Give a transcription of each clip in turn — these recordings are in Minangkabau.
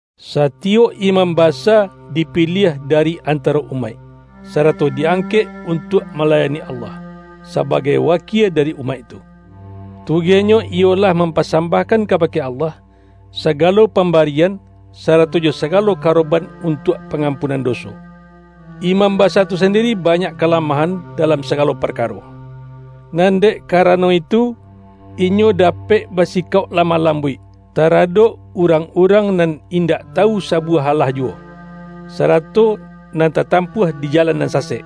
Satiyok imam basa dipiliah dari antaro umaik, sarato di-angkek untuak malayani Allah, sabagai wakie dari umaik tu. Tugehnyo iyolah mam-pasambahkan kabake Allah, sagalo pambarian sarato jo sagalo karoban untuak pangampunan doso. Imam basa tu sandiri banyak kalamahan da-lam sagalo parkaro, nan dek karano itu, inyo dapek basikauk lamah lam-buik, taradok urang-urang nan indak tawu sabuwah alah juwo, sarato nan tatampuah di jalan nan sasek.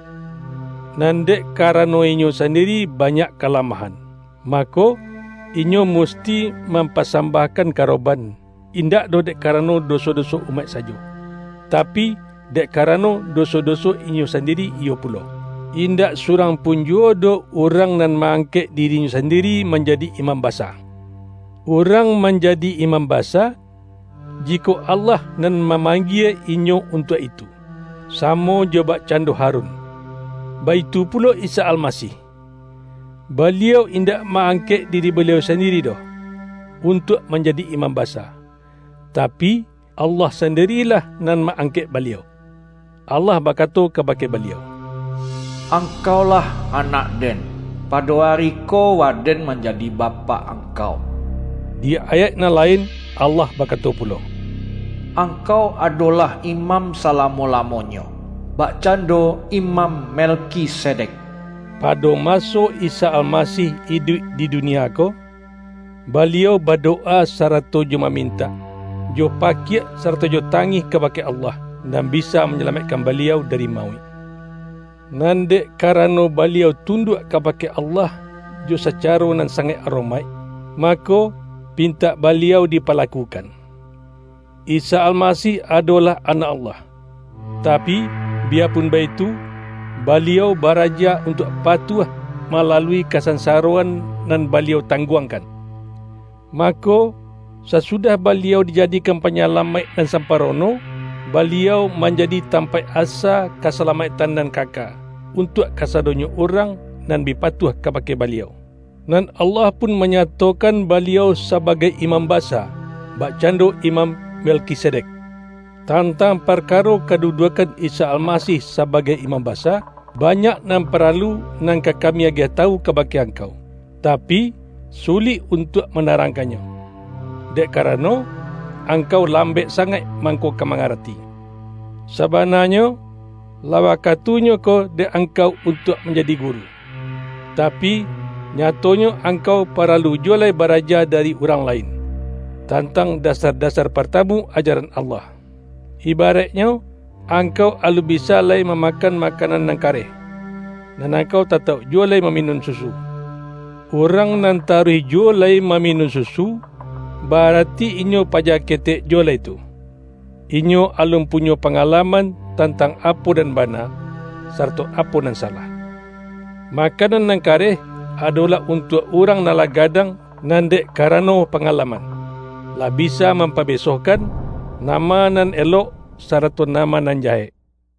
Nan dek karano inyo sandiri banyak ka-lamahan, mako, inyo musti mampa-sambahkan karoban, indak doh dek karano doso-doso umaik sajo, tapi, dek karano doso-doso inyo sandiri iyo pulo. Indak surang pun juwo doh urang nan ma-angkek dirinyo sandi-ri manjadi imam basa. Urang manjadi imam basa, jikok Allah nan mamang-gie inyo untuak itu — samo jo bakcan-do Harun. Baitu pulo Isa Almasih. Baliau in-dak ma-angkek diri Baliau sandiri doh, untuak manjadi Imam Basa. Ta-pi, Allah sandirilah nan ma-angkek Baliau. Allah bakato kabake Baliau,”Angkau-lah Anak-Den; pado ari ko Waden manjadi Bapak Angkau.” Di ayaik nan lain Allah bakato pu-lo,”Angkau adolah Imam salamo-lamonyo, bakcando Imam Melkisedek.” Pado maso Isa Almasih iduik di dunia ko, Baliau badowa sarato jo mamintak, jo pakiak sarato jo tangih kabake Allah, nan bisa manyalamaik-kan Baliau dari mauik. Nan dek ka-rano Baliau tunduak kabake Allah jo sacaro nan sangaik aromaik, mako, pintak Baliau dipalakukan. Isa Al-masih adolah Anak Allah, tapi, biya-pun baitu, Baliau baraja untuak pa-tuah malalui kasansaroan nan Baliau tangguangkan. Mako, sasudah Baliau dijadikan Panyalamaik nan sam-parono, Baliau manjadi tampaik asa kasalamaiktan nan kaka, untuak ka-sadonyo urang nan bi patuah kabake Baliau, nan Allah pun manyatokan Baliau sabagai Imam Basa, bakcando Imam Melkisedek! Tantang parkaro kaduduakkan Isa Almasih sabagai Imam Basa, ba-nyak nan paralu nan ka kami agiah tawu kabake angkau, tapi, sulik un-tuak manarangkannyo, dek karano, angkau lambek sangaik mangko ka mangarati. Sabananyo, lah waka-tunyo ko dek angkau untuak manja-di guru, tapi, nyatonyo angkau pa-ralu juwo lai baraja dari urang lain, tantang dasar-dasar partamu ajaran Allah. Ibaraiknyo, angkau alun bi-sa lai mamakan makanan nan kareh; nan angkau tatauk juwo lai maminun susu. Urang nan taruih juwo lai ma-minun susu, ba-arati inyo paja ketek juwo lai tu; inyo alun punyo panga-laman tantang apo nan bana, sarato apo nan salah. Makanan nan kareh, adolah untuak urang nan lah gadang nan dek karano pangalaman, lah bisa mampabesohkan, nama nan elok, sa-rato nama nan jahek.